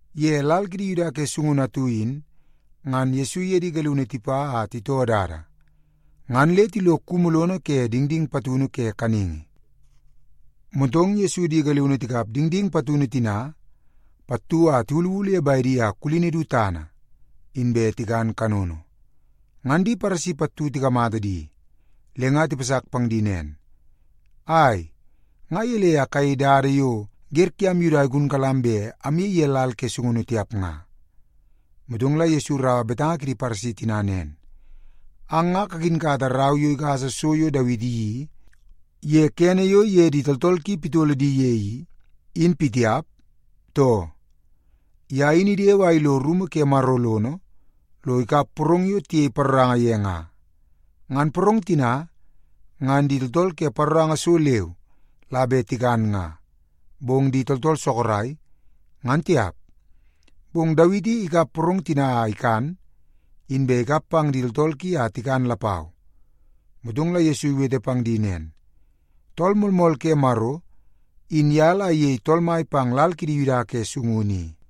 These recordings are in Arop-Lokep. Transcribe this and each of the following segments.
Ye lal kidi Yuda ke sungunu atu in, ngan Yesu iye di galiunu tipa a titoo dada, ngan le tilo kumu lono ke dingding patunu ke kaningi. Motong Yesu di galiunu tikap dingding patunu tina pattu a tiwuluwulu ye bedi a kulini du tana, inbe tikan kanono. Ngan di Paresi pattu tikamata di, le nga tipasak pang di nen, “Ai, nga gelei a kayei dada yo wer kiam Yuda igunkalam bet amyei ye lal ke sungunu tiap nga?” Motong la Yesu iraua betanga kidi Paresi tina nen, “Ang nga kakinkata rau yo igasa so yo Dawiti iyeii ye kene yo iye di tooltool ki pitolo di ye i, in pitiap, too? Ye in idewe a ilo rumu ke Maro lono, lo ikap porong yo tiyei paroranga ye nga. Ngan porong tina, ngan di tooltool ke paroranga so leu la bet tikan nga, bong di tooltool sorok, ngan tiap. Bong Dawiti ikap porong tina a ikan, inbe ikap pang di tooltool ki a tikan lapau.” Motong la Yesu iwete pang di nen, “Tool Moolmool ke Maro, in ye la iyei Tool Mai pang lal kidi Yuda ke sungunu i.”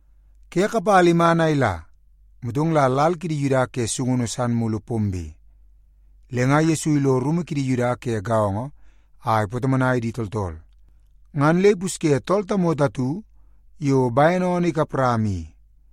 Ke kapala iman a ila, motong la lal kidi Yuda ke sungunu san mulu pombe. Le nga Yesu ilo rumu kidi Yuda ke gaongo a ipatomonai di tooltool. Ngan le ipusye tool tamoto atu yo bene oonoo ikap rama i.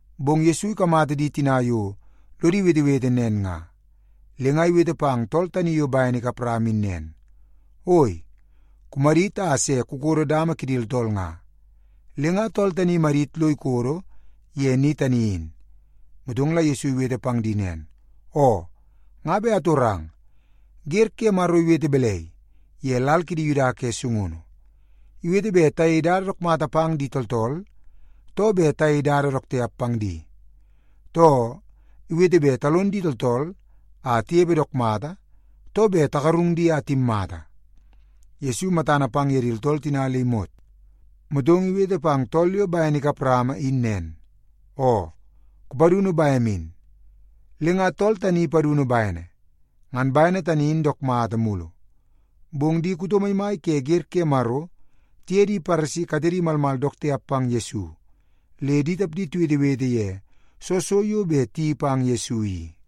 Bong Yesu ikamata di tina yo lodi wetewete nen nga, le nga iwete pang tool tani yo bene ikap rama in nen, “Oi, kumadit a se kukodo dama kidi tooltool nga.” Le nga tool tani imadit lo ikodo ye ni tani in. Motong la Yesu iwete pang di nen, “Oo, nga bet atorang. Wer ke Maro iwete balai ye lal kidi Yuda ke sungunu? Iwete bet tayei dada dook mata pang di tooltool, too bet tayei dada dook tiap pang di? Too, iwete bet talon di tooltool a tinepe dook mata, too bet tagarung di a timmata?” Yesu matana pang ye di tooltool tina le imot, motong iwete pang tool yo bene ikap rama in nen, “Oo, kupadunu bem in.” Le nga tool tani ipadunu bene, ngan bene tani in dook mata mulu. Bong di kuto maimai ke wer ke Maro tiye di Paresi katedi malmal dook tiap pang Yesu, le di tapdi tiwetewete ye soo so yo bet tiyeii pang Yesu i.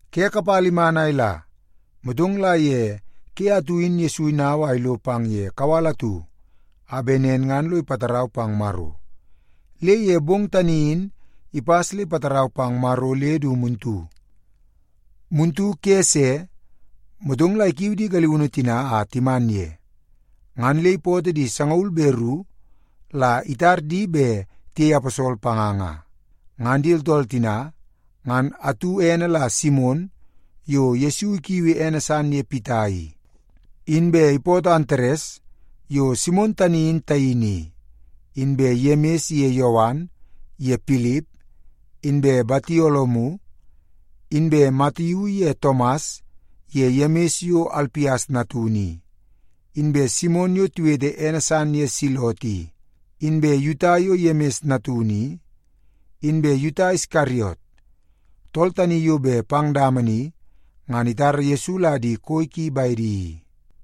Ke kapala iman a ila, motong la ye ke atu in Yesu inau a ilo pang ye kawal atu a bet nen ngan lo ipatarau pang Maro. Le ye bong tani in ipas le ipatarau pang Maro le du muntu. Muntu ke se, motong la ikiu di galiunu tina a timan ye, ngan le ipootoo di sangaul be ru la itar di bet tiyei aposol panga nga. Ngan di tooltool tina ngan atu ene la Simon yo Yesu ikiui ene san ye Pita i. Inbe ipootoo Antares yo Simon tani in taini i, inbe Yemis ye Yowan ye Pilip, inbe Batolomiu, inbe Matiu ye Tomas ye Yemis yo Alpias natunu i, inbe Simon yo tiwete ene san ye Selot i, inbe Yuta yo Yemis natunu i, inbe Yuta Iskariot, tool tani yo bet pang dama ni ngan itara Yesu la di koi ki bedi i.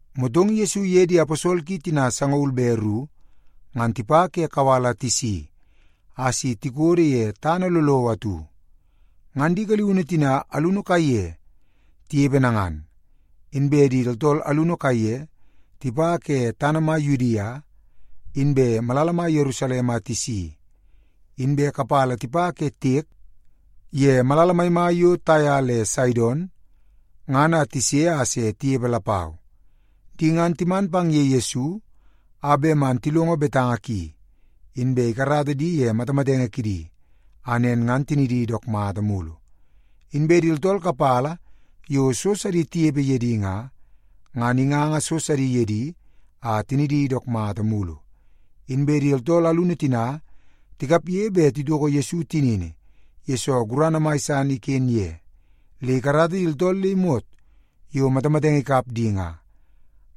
Motong Yesu iye di aposol ki tina sangaul be ru, ngan tipa ke kawal a tisi a si tikodo ye tana lolowo atu. Ngan di galiunu tina alunu kaiye tinepe nangan. Inbe di tooltool alunu kaiye tipa ke tana mai Yudia, inbe malala mai Yerusalem a tisi, inbe kapala tipa ke tiek ye malala maimai yo Taia le Saidon, ngan tise a se tinepe lapau. Di ngan timan pang ye Yesu a bet man tilongo betanga ki, inbe ikarata di ye matamatenge kidi a nen ngan tinidi dook mata mulu. Inbe di tooltool kapala yo so sidi tinepe ye di nga, ngan inganga so sidi ye di a tinidi dook mata mulu. Inbe di tooltool alunu tina tikapge bet titoko Yesu tinini, yesoo gurana mai san iken ye, le ikarata di tooltool le imot yo matamatenge ikap di,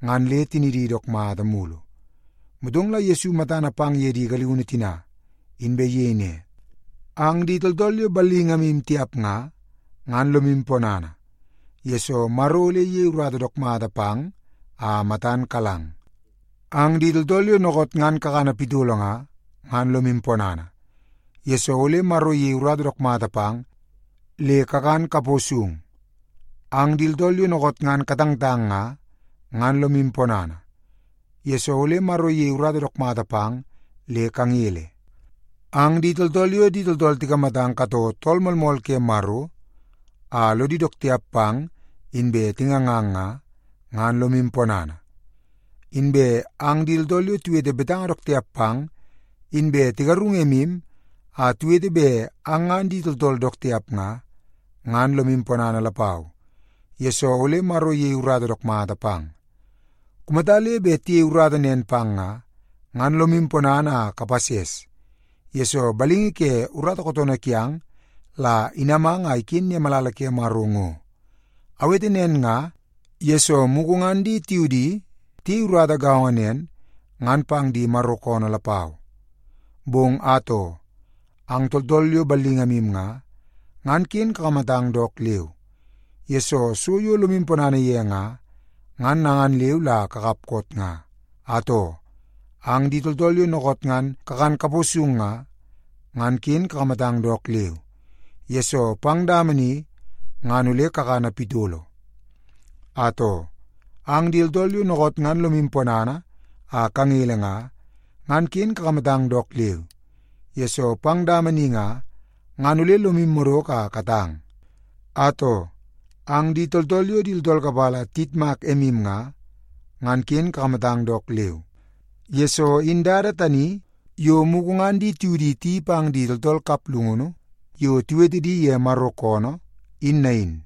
ngan le tinidi dook mata mulu. Motong la Yesu matana pang ye di galiunu tina, inbe iyei ne, “Ang di tooltool yo ballingamu tiap nga, ngan lomu ponana, yesoo Maro ole iyei urata dook mata pang a matan kalang. Ang di tooltool yo dookoot ngan kakana pitolo nga, ngan lomu ponana, yesoo ole Maro iyei urata dook mata pang le kakan kapo sung. Ang di tooltool yo dookoot ngan katangtang nga, ngan lomu ponana, yesoo ole Maro iyei urata dook mata pang le kangele. Ang di tooltool yo di tooltool tikamatang katoo Tool Moolmool ke Maro, a lodi dook tiap pang inbe tingangang nga, ngan lomu ponana. Inbe ang di tooltool yo tiwete betanga dook tiap pang, inbe tigarung emu a tiwete bet ang ngan di tooltool dook tiap nga, ngan lomu ponana lapau, yesoo ole Maro iyei urata dook mata pang. “Kumata le bet tiyei urata nen pang nga, ngan lomu ponana a kapases, yesoo balingi ke urata kootoonoo kiang la inamang a iken ye malala ke Maro ngo. Awete nen nga, yesoo mugu ngan di tiudi tiyei urata gaongo nen ngan pang di Maro koonoo lapau. Bong atoo, ang tooltool yo ballingamu nga, ngan ken kakamatang dook leu, yesoo so yo lomu ponana ye nga, ngan nangan leu la kakap koot nga. Atoo, ang di tooltool yo dookoot ngan kakan kapo sung nga, ken kakamatang dook leu, yesoo pang dama ni, ngan ole kakana pitolo. Atoo, ang di tooltool yo dookoot ngan lomu ponana a kangele nga, ngan ken kakamatang dook leu, yesoo pang dama ni nga, ngan ole lomu madoko a katang. Atoo, ang di tooltool yo di tooltool kapala tiyitmak emu nga, ngan ken kakamatang dook leu, yesoo in dada tani yo mugu ngan di tiudi tiyeii pang di tooltool kaplungunu yo tiwete di ye Maro koonoo, in nain.”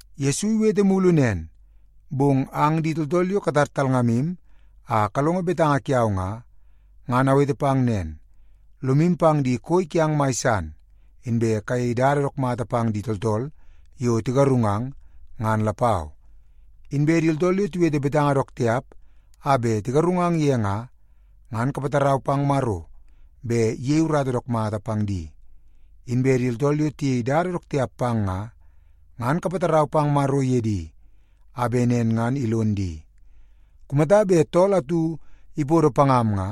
Yesu iwete mulu nen, “Bong ang di tooltool yo katar talngamu a kalongo betanga kiau nga, ngan awete pang nen, lomu pang di koi kiang mai san, inbe kayei dada dook mata pang di tooltool yo tigarungang, ngan lapau. Inbe di tooltool yo tiwete betanga dook tiap a bet tigarungang ye nga, ngan kapatarau pang Maro bet iyei urata dook mata pang di. Inbe di tooltool yo tiyei dada dook tiap pang nga, ngan kapatarau pang Maro ye di, a bet nen ngan ilon di. Kumata bet tool atu ipodo pangam nga,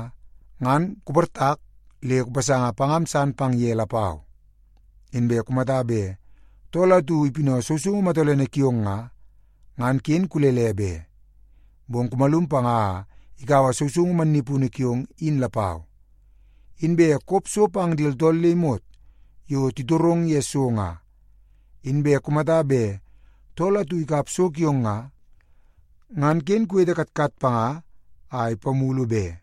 ngan kuportak le kupasanga pangam san pang ye lapau. Inbe kumata bet tool atu ipinau sousoungu matolene kiong nga, ngan ken kulele be, bong kumalum panga a ikaua sousoungu mannipunu kiong in lapau. Inbe kop so pang di tooltool le imot yo titorong ye so nga. Inbe kumata bet tool atu ikap so kiong nga, ngan ken kuwete katkat panga a ipamulu be.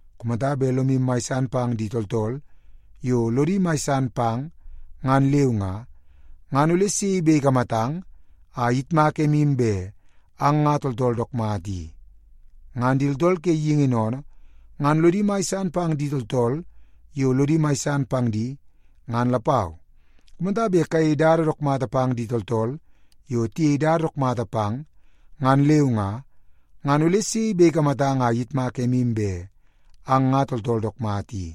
“Kumata bet lomu mai san pang di tooltool yo lodi mai san pang, ngan leu nga, ngan ole sei bet ikamatang a iyitmak emu bet ang nga tooltool dook mata i? Ngan di tooltool ke geingi sennene, ngan lodi mai san pang di tooltool yo lodi mai san pang di, ngan lapau. Kumata bet kayei dada dook mata pang di tooltool yo tiyei dada dook mata pang, ngan leu nga, ngan ole sei bet ikamatang a iyitmak emu bet ang nga tooltool dook mata i?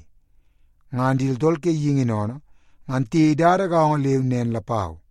Ngan di tooltool ke geingi sennene, ngan tiyei dada gaongo leu nen lapau.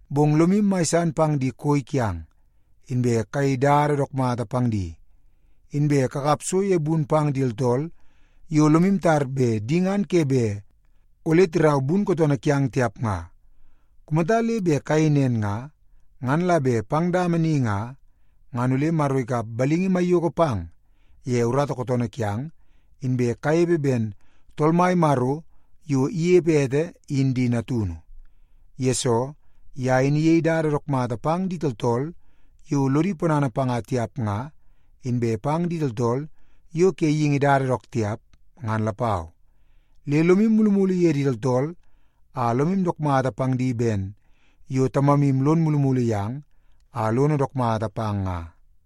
Bong lomu mai san pang di koi kiang, inbe kayei dada dook mata pang di. Inbe kakap so ye bun pang di tooltool yo lomu tar bet di ngan ke bet ole tirau bun kootoonoo kiang tiap nga. Kumata le bet kayei nen nga, ngan la bet pang dama ni nga, ngan ole Maro ikap balingi maiyoko pang ye urata kootoonoo kiang, inbe kanepe ben Tool Mai Maro yo inepe ete in di natunu. Yesoo, ye in iyei dada dook mata pang di tooltool yo lodi ponana panga tiap nga, inbe pang di tooltool yo ke geingi dada dook tiap, ngan lapau. Le lomu mulumulu ye di tooltool a lomu dook mata pang di ben yo Tamamu lono mulumulu yang a lono dook mata pang nga.”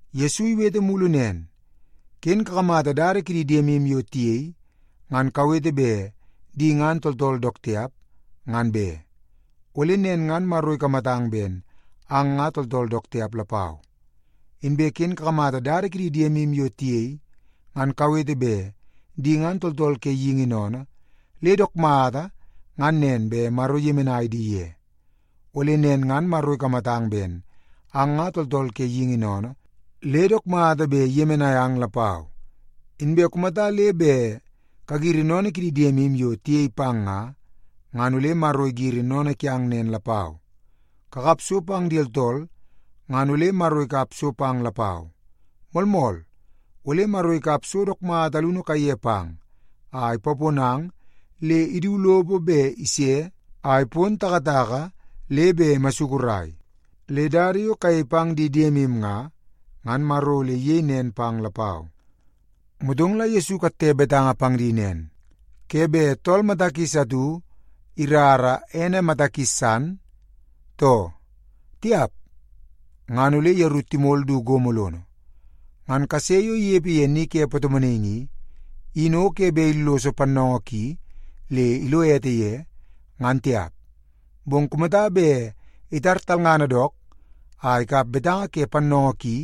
Yesu iwete mulu nen, “Ken kakamata dada kidi diemu yo tiyei, ngan kawete bet di ngan tooltool dook tiap, ngan be. Ole nen ngan Maro ikamatang ben ang nga tooltool dook tiap lapau. Inbe ken kakamata dada kidi diemu yo tiyei, ngan kawete bet di ngan tooltool ke geingi sennene le dook mata ngan nen bet Maro iyemenai di ye. Ole nen ngan Maro ikamatang ben ang nga tooltool ke geingi sennene le dook mata bet iyemenai ang lapau. Inbe kumata le bet kagiri sennene kidi diemu yo tiyei pang nga, ngan ole Maro igiri sennene kiang nen lapau. Kakap so pang di tooltool ngan ole Maro ikap so pang lapau. Moolmool, ole Maro ikap so dook mata alunu kaiye pang a ipaponang le idu lopo bet ise a ipon takataka le bet imasukurai. Le dada yo kayei pang di diemu nga, ngan Maro ole iyei nen pang lapau.” Motong la Yesu ikatte betanga pang di nen, “Ke bet tool mata kis atu irara ene mata kis san, too? Tiap! Ngan ole yeru timol du gomo lono. Ngan kase yo inepe ye ni ke patomonaingi i, in o ke bet illoso pannoongoo ki le ilo ete ye, ngan tiap. Bong kumata bet itar talngana dook a ikap betanga ke pannoongoo ki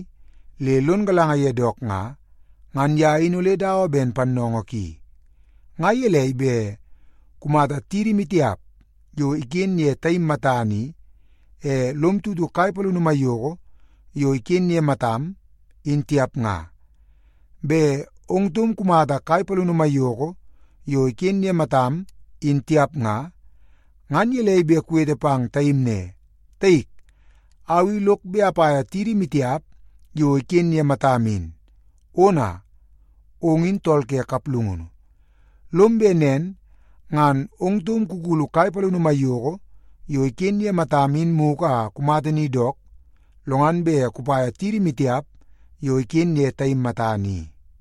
le lon galanga ye dook nga, ngan ye in ole dawa ben pannoongoo ki. “Nga gelei bet kumata tidi maitiap yo iken ye taim matana i, e lom tutu kai palini maiyoko yo iken ye matam, in tiap nga? Bet ong taum kumata kai palini maiyoko yo iken ye matam, in tiap nga, ngan gelei bet kuwete pang taim ne, ‘Taik, au i lok bet apaia tidi maitiap yo iken ye matam in.’ Ona, ong in tool ke kaplungunu! Lom bet nen ngan ong taum kukulu kai palini maiyoko yo iken ye matam in mugu a kumata ni dook, lo ngan bet kupaia tidi maitiap yo iken ye taim matana i.”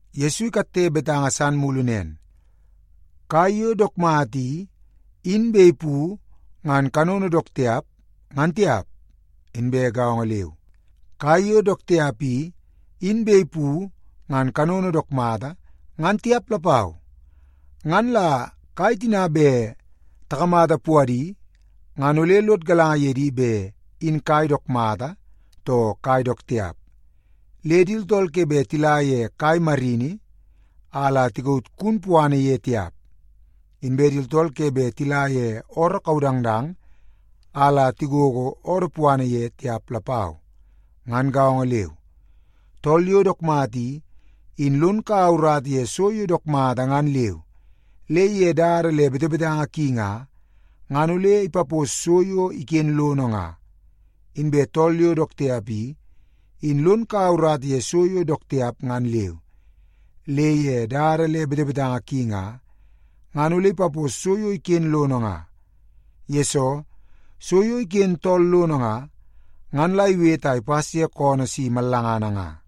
Yesu ikatte betanga san mulu nen, “Kai yo dook mata i, in bet ipu ngan kanono dook tiap, ngan tiap. Inbe gaongo leu, kai yo dook tiap i, in bet ipu ngan kanono dook mata, ngan tiap lapau. Ngan la kai tina bet takamata puadi, ngan ole lod galanga ye di bet in kai dook mata, too kai dook tiap. Le di tooltool ke bet tila ye kai marini, a la tikaut kun puana ye tiap. Inbe di tooltool ke bet tila ye ooroo kaudangdang, a la tigogo oodoo puana ye tiap lapau. Ngan gaongo leu, tool yo dook mata i, in lon kaua urata ye so yo dook mata ngan leu, le ye dada le betebetanga ki nga, ngan ole ipapos so yo iken lono nga. Inbe tool yo dook tiap i, in lon kaua urata ye so yo dook tiap ngan leu, le ye dada le betebetanga ki nga, ngan ole ipapos so yo iken lono nga. Yesoo, so yo iken tool lono nga, ngan la iwete a ipas ye koonoo si mallangana nga.”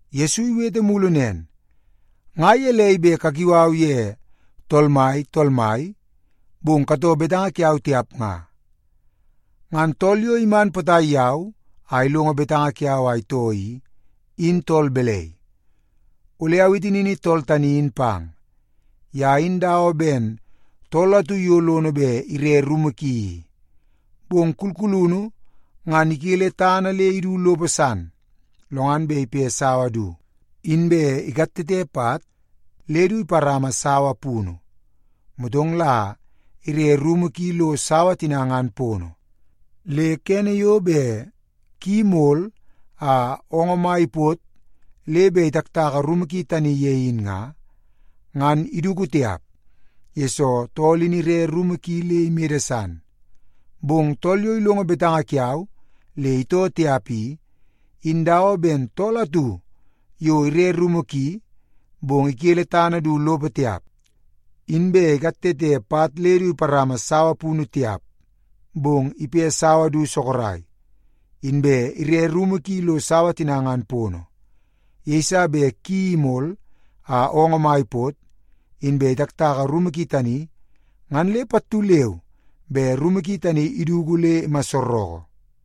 Yesu iwete mulu nen, “Nga gelei bet kakiu au ye ‘Tool Mai, Tool Mai,’ bong katoo betanga kiau tiap nga? Ngan tool yo iman potai yau a ilongo betanga kiau a itoo i, in tool balai? Ole awete nini tool tani in pang. Ye in dawa ben tool atu yo lono bet ire rumu ki i. Bong kulkulunu ngan ikele tana le idu lopo san, lo ngan bet ipe sawa du, inbe ikatete pat le du iparama sawa punu. Motong la ire rumu ki lo sawa tina ngan pono. Le kene yo bet ki imol a oongoo mai ipot le bet itaktaka rumu ki tani ye in nga, ngan iduku tiap, yesoo tool in ire rumu ki le imede san. Bong tool yo ilongo betanga kiau le itoo tiap i, in dawa ben tool atu yo ire rumu ki, bong ikele tana du lopo tiap, inbe ikatete pat le du iparama sawa punu tiap. Bong ipe sawa du sorok, inbe ire rumu ki lo sawa tina ngan pono. Yeiso bet ki imol a oongoo mai ipot, inbe itaktaka rumu ki tani, ngan le pattu leu be rumu ki tani iduku le imassoroko.”